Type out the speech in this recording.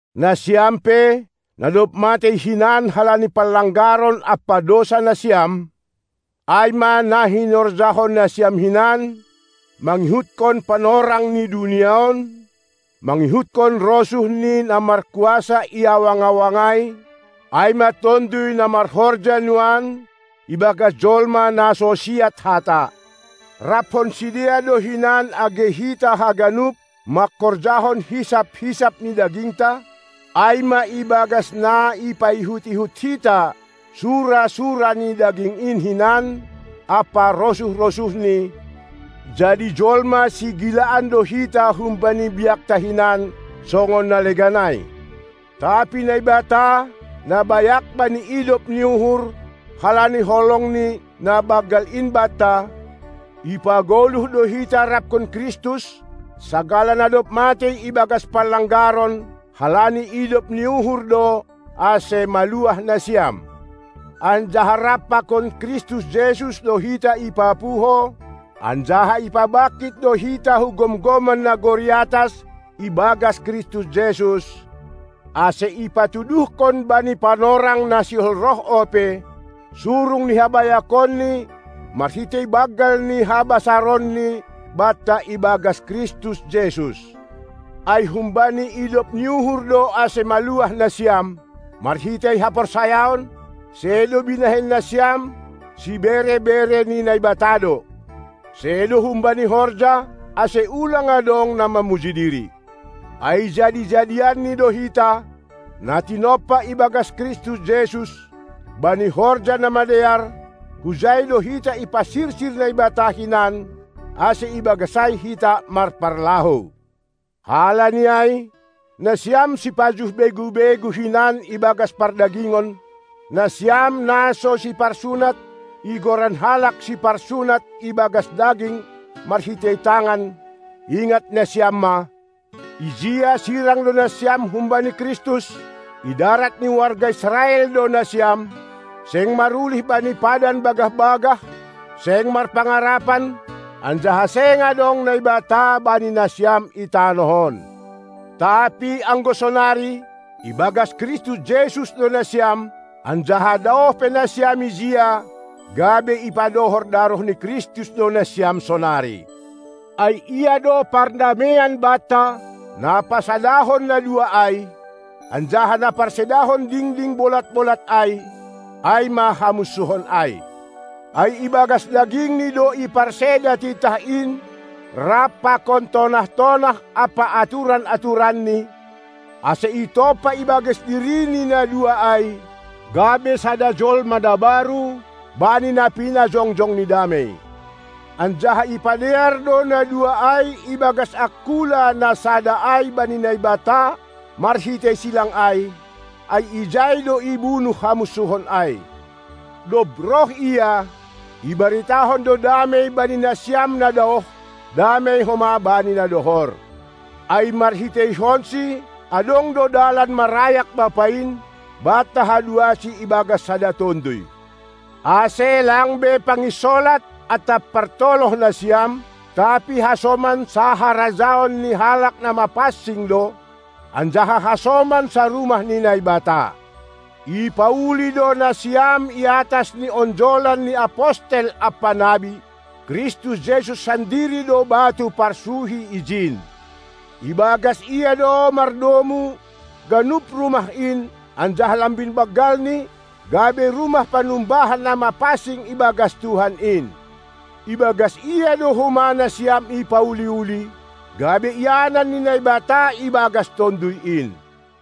Nasiam pe, na dob matei hinan halani panlanggaron ampa dousa nasiam, ai ma na hinorjahon nasiam hinan mangihutkon panorang ni dunia on, mangihutkon rosuh ni na markuasa i awang-awang ai, ai ma tonduy na marhorja nuan ibagas jolma na so siat hata. Raphon sidea do hinan age hita haganup manghorjahon hisap-hisap ni dagingta, ai ma ibagas na ipaihut-ihut hita sura-sura ni daging in hinan ampa rosuh-rosuhni; jadi jolma sigilaan do hita humbani biakta hinan, songon na legan ai. Tapi Naibata, na bayak bani idop ni uhur, halani holongNi na banggal in banta, ipagoluh do hita raphon Kristus, sagala na dob matei ibagas panlanggaron (halani idop ni uhur do, ase maluah nasiam). Anjaha rap pakon Kristus Jesus do hita ipapuho, anjaha ipabangkit do hita hu gomgoman nagori atas ibagas Kristus Jesus, ase ipatuduhkon bani panorang na sihol roh ope, surung ni habayakonNi marhitei banggal ni habasaronni banta ibagas Kristus Jesus. Ai humbani idop ni uhur do ase maluah nasiam, marhitei haporsayaon; sedo binahen nasiam, sibere-bere ni Naibata do. Sedo humbani horja, ase ulang adong na mamuji diri. Ai jadi-jadianNi do hita, na tinompa ibagas Kristus Jesus, bani horja na madear; hujai do hita ipasirsir Naibata hinan, ase ibagas ai hita marparlahou. Halani ai, nasiam sipajuh begu-begu hinan ibagas pardagingon, nasiam "na so siparsunat" igoran halak siparsunat ibagas daging marhitei tangan, ingat nasiam ma: Ijia sirang do nasiam humbani Kristus; idarat ni warga Israel do nasiam, seng marulih bani padan bagah-bagah, seng marpangarapan, anjaha seng adong Naibata bani nasiam i tanoh on. Tapi anggo sonari, ibagas Kristus Jesus do nasiam; anjaha daoh pe nasiam ijia, gabe ipadohor daroh ni Kristus do nasiam sonari. Ai Ia do pardameian banta, na pasadahon na dua ai, anjaha na parsedahon dingding bolat-bolat ai, ai ma hamunsuhon ai. Ai ibagas dagingNi do iparseda titah in rap pakon tonah-tonah ampa aturan-aturanNi, ase itompah ibagas diriNi na dua ai, gabe sada jolma na baru, bani na pinajongjongNi damei. Anjaha ipadear do na dua ai ibagas angkula na sada ai bani Naibata marhitei silang ai; ai ijai do ibunuh hamunsuhon ai. Dob roh Ia, ibaritahon do damei bani nasiam na daoh, damei homa bani na dohor. Ai marhiteihonSi adong do dalan marayak Bapa in, banta haduasi ibagas sada Tonduy. Ase lang be panginsolat atap partoloh nasiam, tapi hasoman saharajaon ni halak na mapansing do, anjaha hasoman sarumah ni Naibata. Ipauli do nasiam iatas ni onjolan ni apostel ampa nabi; Kristus Jesus sandiri do batu parsuhi ijin. Ibagas Ia do mardomu ganup rumah in anjaha lambin banggalni, gabe rumah panumbahan na mapansing ibagas Tuhan in. Ibagas Ia do homa nasiam ipauli-uli, gabe ianan ni Naibata ibagas Tonduy in.